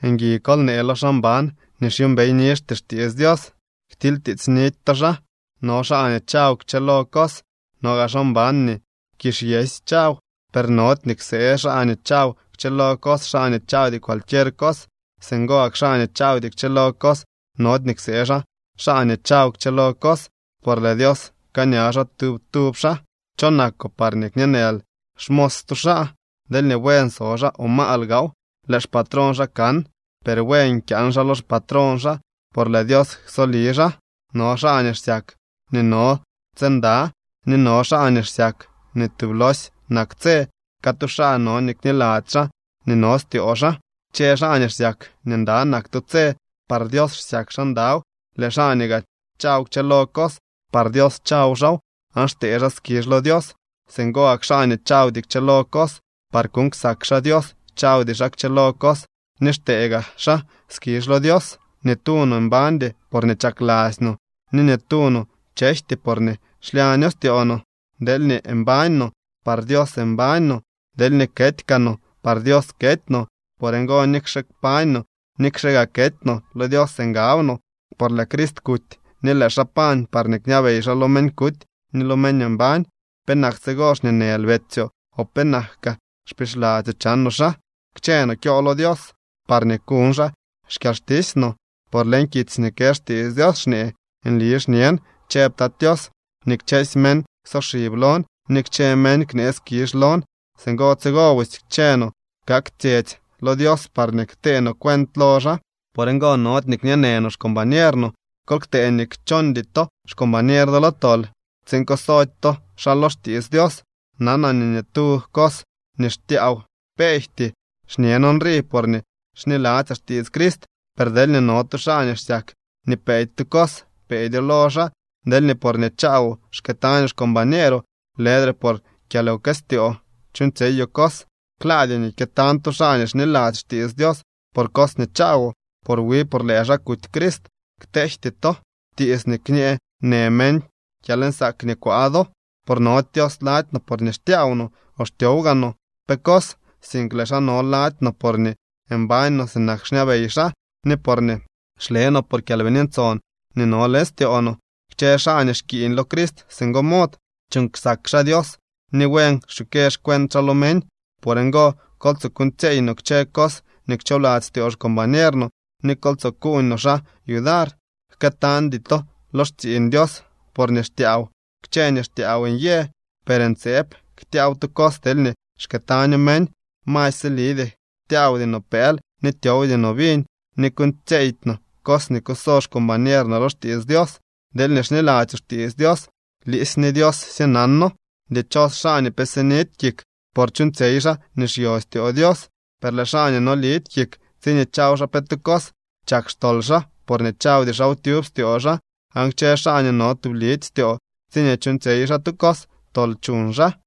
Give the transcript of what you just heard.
Ngui kol nee lo xaa mban nii xyuumbey nizhty xtiits Dios. Ktilytiitsnidy to xaa. No xaa nii chaw kchëlo cos. No gaa xaa mban nii kizh yësy chaw. Per nody nii ksee xaa nii chaw kchëlo cos xaa nii chawdy cualquier cos. Singo gak xaa nii chawdy kchëlo cos nody nii ksee xaa nii chaw kchëlo cos, por lëë Dios pkaaña xaa tub tub xaa. ¿Cho nakoo parñee kñeenël xmos stu xaa? Deelñee buen so xaa o maal gaaw, lëë xpatrón xaa kan. Per buen kyaan xaa lo xpatrón xaa, por lëë Dios ksoli xaa. No xaa nii xsyak nii no tse nda, ni no xaa nii xsyak nii tublosy nak tse. Catu xaa no nii kniladzy xaa nii no styoo xaa. Kchë xaa nii xsyak nii nda nak tu tse, par Dios xsyak xaa ndaw. Lëë xaa nii gaa chaw kchëlo cos, par Dios chaw xaaw aan xtee xaa skizh lo Dios. Singo gak xaa nii chawdy kchëlo cos, par kuuñ ksak xaa Dios chawdy xaa kchëlo cos ni xtee gaa xaa skizh lo Dios. Ni tu no mbañdy porñee chakladzy no, ni ni tu no chejty porñee xlyaño styoo no. Deelñee mbañ no, par Dios mbañ no. Deelñee kety kaa no, par Dios kety no. Por ngo nikxe kpañ no, nikxe gaa kety no, lo Dios ngab no. Por lëë Crist kuty ni lëë xaa pañ parñee kñabey xaa lo meñ kuty ni lo meñ mbañ. ¿Penak tsigo xñeenël betsyoo? ¿O penak kaa xpixladzyoo chanoo xaa? Kchë no kyo lo Dios parñee kuñ xaa xkyalxtisy no. Por leñ kitsy nii kë xtiits Dios xñee: Nli xñen, chëb Tat Tios, nii kchësy meñ ksoxib lon, ni kchë meñ knee skizh lon. Singo tsigo busy kchë no kak tsyetsy lo Dios parñee ktee no cuent lo xaa. Por ngo nody nii kñeenë no xcombañer no. Kol ktee nii kchondy to xcombañer do lo tol tsiin kusody to xaa lo xtiits Dios. Nanaa nii ni tu cos nii xtyaaw peejty. Xñen nrii porñee xniladzyaa xtiits Crist. Per deelñee no tu xaa nii xsyak nii peedy tu cos, peedyo lo xaa. Deelñee porñee chaawoo xkëëtañoo xcombañeeroo, lëdre por kyalwkëstyoo chuuñtsyeyoo cos. Klaadyoo nii kyëtañ tu xaa nii xniladzy xtiits Dios por cos nii chaawoo, por wi por lëë xaa kuty Crist. Kteejty to tiits nii kñeenë meñ kyalnsaak nii kwaa do. Por nody Dios lady no porñee xtyaaw no o xtyow gaa no pe cos, sink lëë xaa no lady no porñee mbañ no sinak xñabey xaa ni porñee xle no por Kyalbini Ntson nii no leñ styoo no. Kchë xaa nii xkiiñ lo Crist singo mod, chuuñ ksak xaa Dios ni buen xchukë xcuent xaa lo meñ. Por ngo, kol tsoo kuuñtsyeey no kchë cos nii kchoobladzy styoo xcombañer no, ni kol tsoo kuuñ no xaa yudar. Jkëtañdy to lo xtsiiñ Dios por nii xtyaaw. Kchë nii xtyaaw nyë, per ntseeb ktyaaw tu cos deelñee xkëëtaño meñ. Masy silidyee tyaawdy no pëël ni tyowdy no viñ ni kuuñtsyeydy no cos nii kuso xcombañer no lo xtiits Dios. Deelñee xniladzyoo xtiits Dios, liisy ni Dios sye nano. ¡Dichos xaa nii pe sinidy kik por chuuñtsyey xaa nii xyo styoo Dios! Per lëë xaa nii nolidy kik tsiñee chaw xaa pe tu cos, chak xtol xaa, porñee chawdy xaaw tyub styoo xaa. Aan kchë xaa nii no tublidy styoo tsiñee chuuñtsyey xaa tu cos, tol chuñ xaa.